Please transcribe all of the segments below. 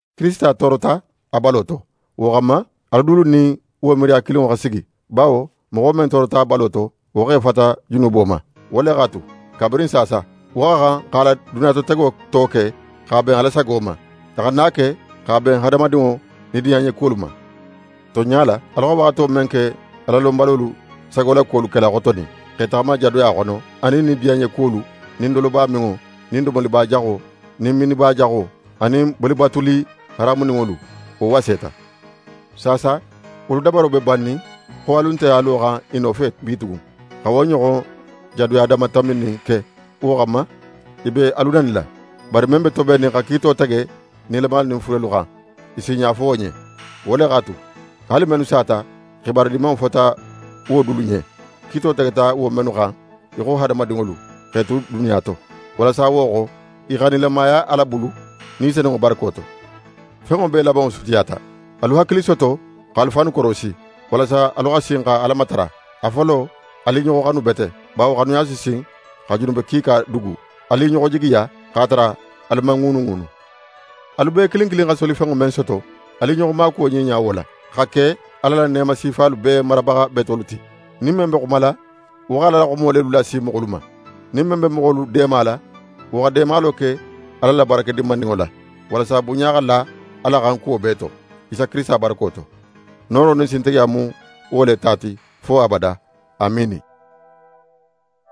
Kirisita toorota a balo to, wo xanma, alu dulu nin wo miiriya kilinŋo xa sigi, bawo moxo men toorota a balo to, wo x'é fata junubo ma. Wo le x'a tu, kabirin saasa, wo xa xan x'a la duniyatotego to ke x'a ben Ala sago ma, a xana a ke x'a ben hadamadinŋo nidiyanɲekuwolu ma. Tonɲa la, alu xa waxato men ke Alalonbalolu sagolakuwolu kela xotonin, x'e taxama jadoya xono, anin nidiyanɲekuwolu, nin dolobaminŋo, nin domoliba jaxo, nin minniba jaxo, anin bolibatuli haramuninŋolu, wo waseta. Saasa, wolu dabaro be bannin xo alu nte a loxan i nofe bitugun, xa wo ɲoxon jadoya danmatanbinin ke, wo xanma, i be alu nanila. Bari men be tobennin xa kiito tege nilamalu nin furelu xan, i si i ɲafo wo ɲen. Wo le x'a tu, haali mennu sata, xibaru Dimanŋo fota wo dulu ɲen, kiito tegeta wo mennu xan í xo hadamadinŋolu, x'e tu duniya to, walasa wo xo, i xa nilamaya Ala bulu, Ni Senunŋo barako to. Fenŋo bee labanŋo sutiyata. Alu hakili soto, x'alu fannu korosi, walasa alu xa sin xa Ala matara. A folo, alu i ɲoxo xanu bete, bawo xanuya si sin xa junube kiika dugu. Alu i ɲoxo jigiya, x'a tara alu man ŋuunuŋuunu. Alu bee kilin kilin xa solifenŋo men soto, alu i ɲoxo maakuwo ɲiɲa wo la, xa ke Ala la neema sifalu bee marabaxa betolu ti. Nin men be xumala, wo xa Ala la xumo lelu lasi moxolu ma. Nin men be moxolu deemala, wo xa deemalo ke Ala la barake dinmaninŋo la, walasa bunɲa xa la Ala xan kuwo bee to, Isa Kirisita barako to. Nooro nin sintigiya mu wo le ta ti, fo abada. Amiini!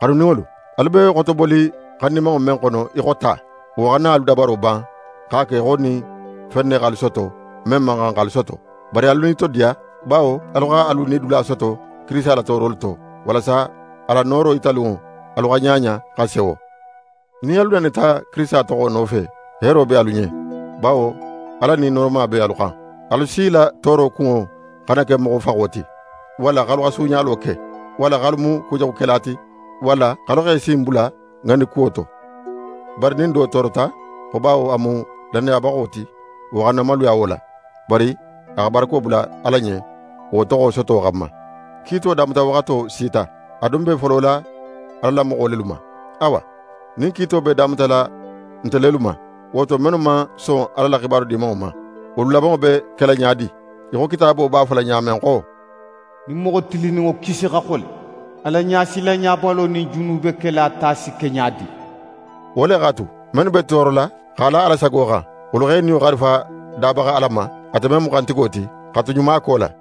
Xanuninŋolu, alu be xotoboli xandimanŋo men xono í xo ta, wo xana alu dabaro ban x'a ke í xo fen ne x'alu soto men man xan x'alu soto. Bari alu nitodiya, bawo alu xa alu nidula soto Kirisita la toorolu to, walasa a la nooro yitalunŋo, alu xa ɲaɲa, xa sewo. Nin alu nanita Kirisita toxo nofe, heero be alu ɲen, bawo Ala Ni nooroma be alu xan. Alu si la tooro kunŋo xana ke moxo faxo ti, walla x'alu xa suuɲalo ke, walla x'alu mu kujaxukela ti, walla x'alu x'e sin bula ŋandi kuwo to. Bari nin do toorota xo bawo a mu lannayabaxo ti, wo xana maluya wo la, bari a xa barako bula Ala ɲen wo toxo soto xanma. Kiito damutawaxato sita, a dun be folola Ala la moxo lelu ma. Awa, nin kiito be damutala nte lelu ma, wo to mennu man son Ala la xibaru Dimanŋo ma, wolu labanŋo be kela ɲa di? Í xo Kitaabo b'a fola ɲa men xo: «Nin moxo tilinninŋo kisi xa xole, Ala ɲasilanbalo nin junubekela ta si ke ɲa di?» Wo le x'a tu, mennu be toorola x'a la Ala sago xan, wolu x'e niyo xarifa Dabaxa Ala ma, ate men mu xantigo ti, xa tu ɲumako la.